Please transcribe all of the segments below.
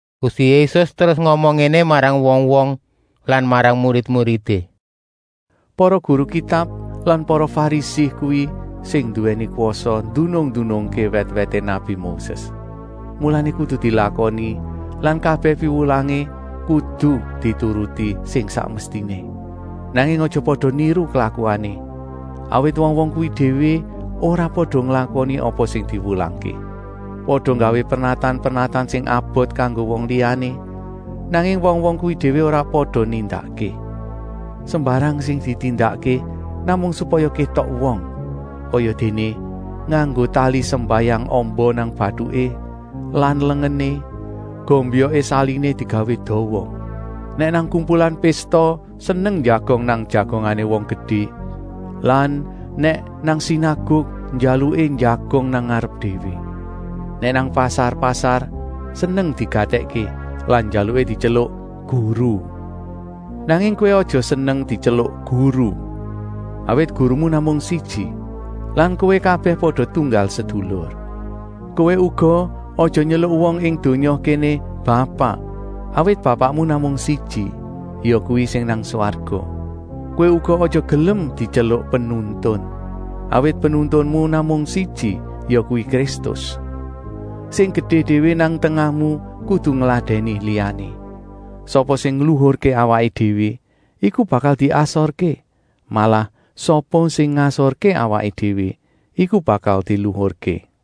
Gusti Yésus terus ngomong ngéné marang wong-wong lan marang murid-muridé: “Para guru Kitab lan para Farisi kuwi sing nduwèni kwasa ndunung-ndunungké wèt-wèté nabi Moses. Mulané kudu dilakoni lan kabèh piwulangé kudu dituruti sing sak mestiné. Nanging aja pada niru klakuané, awit wong-wong kuwi déwé ora pada nglakoni apa sing diwulangké. Pada nggawé pernatan-pernatan sing abot kanggo wong liyané, nanging wong-wong kuwi déwé ora pada nindakké. Sembarang sing ditindakké namung supaya kétok wong. Kayadéné: nganggo tali sembayang amba nang batuké lan lengené, gombyoké saliné digawé dawa. Nèk nang kumpulan pésta seneng njagong nang jagongané wong gedé lan nèk nang sinaguk njaluké njagong nang ngarep déwé. Nèk nang pasar-pasar seneng digatèkké lan njaluké dityeluk ‘Guru’. Nanging kowé aja seneng dityeluk ‘Guru’, awit gurumu namung siji lan kowé kabèh pada tunggal sedulur. Kowé uga aja nyeluk wong ing donya kéné ‘Bapak’, awit bapakmu namung siji, yakuwi sing nang swarga. Kowé uga aja gelem dityeluk ‘Penuntun’, awit penuntunmu namung siji, yakuwi Kristus. Sing gedé déwé nang tengahmu kudu ngladèni liyané. Sapa sing ngluhurké awaké déwé, iku bakal diasorké, malah sapa sing ngasorké awaké déwé, iku bakal diluhurké.”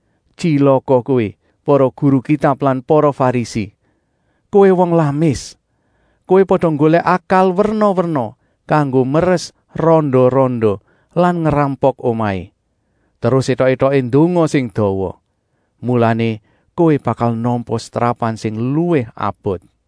Tyilaka kowé, para guru Kitab lan para Farisi! Kowé wong lamis. Kowé pada nggolèk akal werna-werna kanggo meres randa-randa lan ngrampok omahé. Terus étok-étoké ndonga sing dawa. Mulané kowé bakal nampa setrapan sing luwih abot.)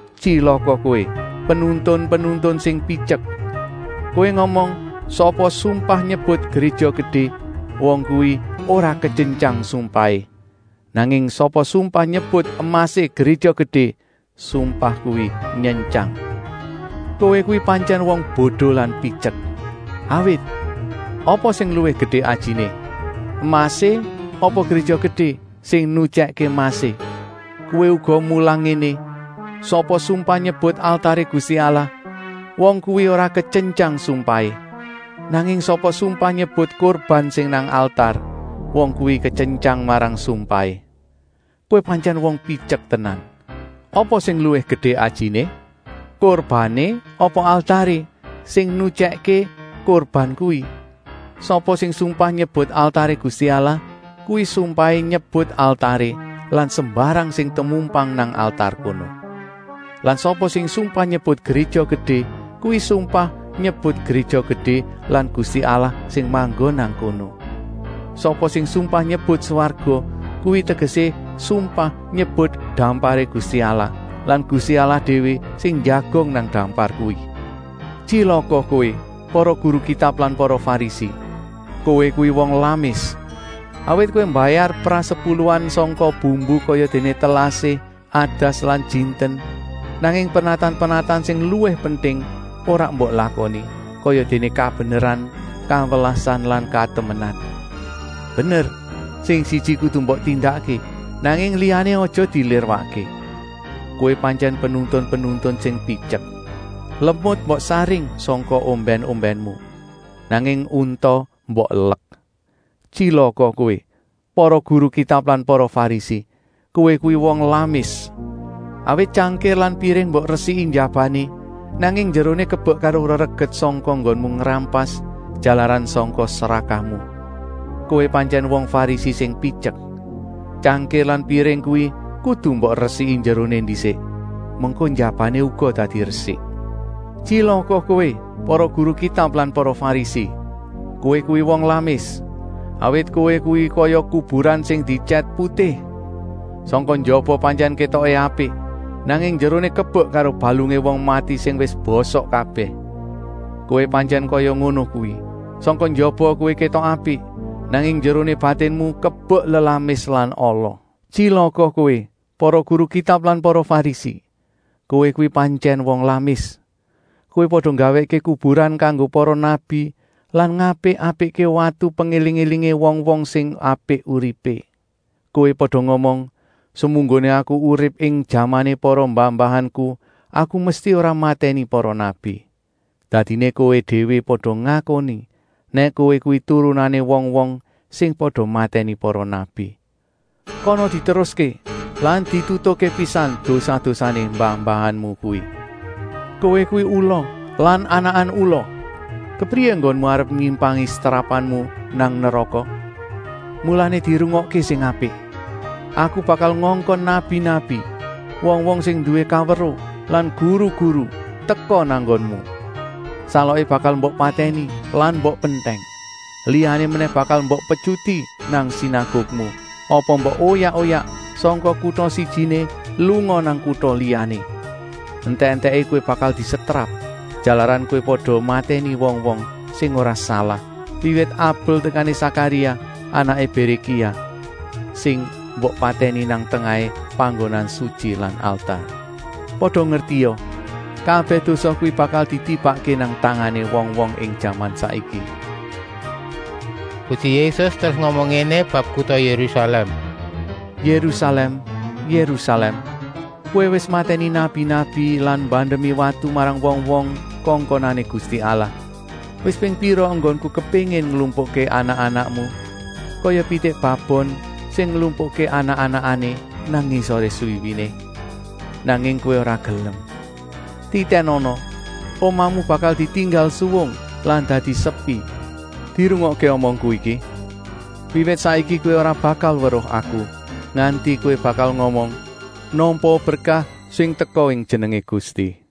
“Tyilaka kowé, penuntun-penuntun sing pityek. Kowé ngomong: ‘Sapa sumpah nyebut Gréja Gedé, wong kuwi ora ketyentyang sumpahé. Nanging sapa sumpah nyebut emasé Gréja Gedé, sumpah kuwi nyentyang.’ Kowé kuwi pantyèn wong bodo lan pityek. Awit, apa sing luwih gedé ajiné: emasé apa Gréja Gedé, sing nyutyèkké emasé? Kowé uga mulang ngéné: ‘Sapa sumpah nyebut altaré Gusti Allah, wong kuwi ora ketyentyang sumpahé. Nanging sapa sumpah nyebut kurban sing nang altar, wong kuwi ketyentyang marang sumpahé.’ Kowé pantyèn wong pityek tenan! Apa sing luwih gedé ajiné: kurbané apa altaré, sing nyutyèkké kurban kuwi? Sapa sing sumpah nyebut altaré Gusti Allah, kuwi sumpahé nyebut altaré lan sembarang sing temumpang nang altar kono. Lan sapa sing sumpah nyebut Gréja Gedé kuwi sumpah nyebut Gréja Gedé lan Gusti Allah sing manggon nang kono. Sapa sing sumpah nyebut swarga, kuwi tegesé sumpah nyebut damparé Gusti Allah lan Gusti Allah déwé sing njagong nang dampar kuwi. “Tyilaka kowé, para guru Kitab lan para Farisi. Kowé kuwi wong lamis. Awit kowé mbayar prasepuluhan sangka bumbu kayadéné telasih, adas lan jinten, nanging pernatan-pernatan sing luwih penting ora mbok lakoni, kayadéné kabeneran, kawelasan lan katemenan. Bener, sing siji kudu mbok tindakké, nanging liyané aja dilirwakké. Kowé pantyèn penuntun-penuntun sing pityek. Lemut mbok saring sangka ombèn-ombènmu, nanging unta mbok elek. “Tyilaka kowé, para guru Kitab lan para Farisi! Kowé kuwi wong lamis. Awit tyangkir lan piring mbok resiki njabané, nanging njeroné kebek karo rereget sangka enggonmu ngrampas, jalaran sangka srakahmu. Kowé pantyèn wong Farisi sing pityek. Tyangkir lan piring kuwi kudu mbok resiki njeroné ndisik, mengko njabané uga dadi resik. “Tyilaka kowé, para guru Kitab lan para Farisi! Kowé kuwi wong lamis. Awit kowé kuwi kaya kuburan sing dietyèt putih. Sangka njaba pantyèn kétoké apik, nanging njeroné kebek karo balungé wong mati sing wis bosok kabèh. Kowé pantyèn kaya ngono kuwi: sangka njaba kowé kétok apik, nanging njeroné batinmu kebek lelamis lan ala. “Tyilaka kowé, para guru Kitab lan para Farisi. Kowé kuwi pantyèn wong lamis. Kowé pada nggawèkké kuburan kanggo para nabi lan ngapik-apikké watu pengéling-élingé wong-wong sing apik uripé. Kowé pada ngomong: ‘Semunggoné aku urip ing jamané para mbah-mbahanku, aku mesti ora matèni para nabi.’ Dadiné kowé déwé pada ngakoni nèk kowé kuwi turunané wong-wong sing pada matèni para nabi. Kono diteruské lan ditutukké pisan dosa-dosané mbah-mbahanmu kuwi! Kowé kuwi ula lan anakan ula. Kepriyé enggonmu arep nyimpangi setrapanmu nang neraka? Mulané dirungokké sing apik. Aku bakal ngongkon nabi-nabi, wong-wong sing nduwé kaweruh lan guru-guru teka nang nggonmu. Saloké bakal mbok patèni lan mbok pentèng, liyané menèh bakal mbok petyuti nang sinagukmu apa mbok oyak-oyak sangka kuta sijiné lunga nang kuta liyané. Entèk-entèké kowé bakal disetrap, jalaran kowé pada matèni wong-wong sing ora salah, wiwit Abel tekané Sakaria, anaké Bérékia, sing mbok patèni nang tengahé panggonan sutyi lan altar. Pada ngertia: kabèh dosa kuwi bakal ditibakké nang tangané wong-wong ing jaman saiki.” Gusti Yésus terus ngomong ngéné bab kuta Yérusalèm: “Yérusalèm, Yérusalèm! Kowé wis matèni nabi-nabi lan mbandemi watu marang wong-wong kongkonané Gusti Allah. Wis ping pira enggonku kepéngin nglumpukké anak-anakmu kaya pitik babon sing nglumpukké anak-anakané nang ngisoré swiwiné. Nanging kowé ora gelem. Titènana, omahmu bakal ditinggal suwung lan dadi sepi. Dirungokké omongku iki: wiwit saiki kowé ora bakal weruh Aku, nganti kowé bakal ngomong: ‘Nampaa berkah sing teka ing jenengé Gusti.’”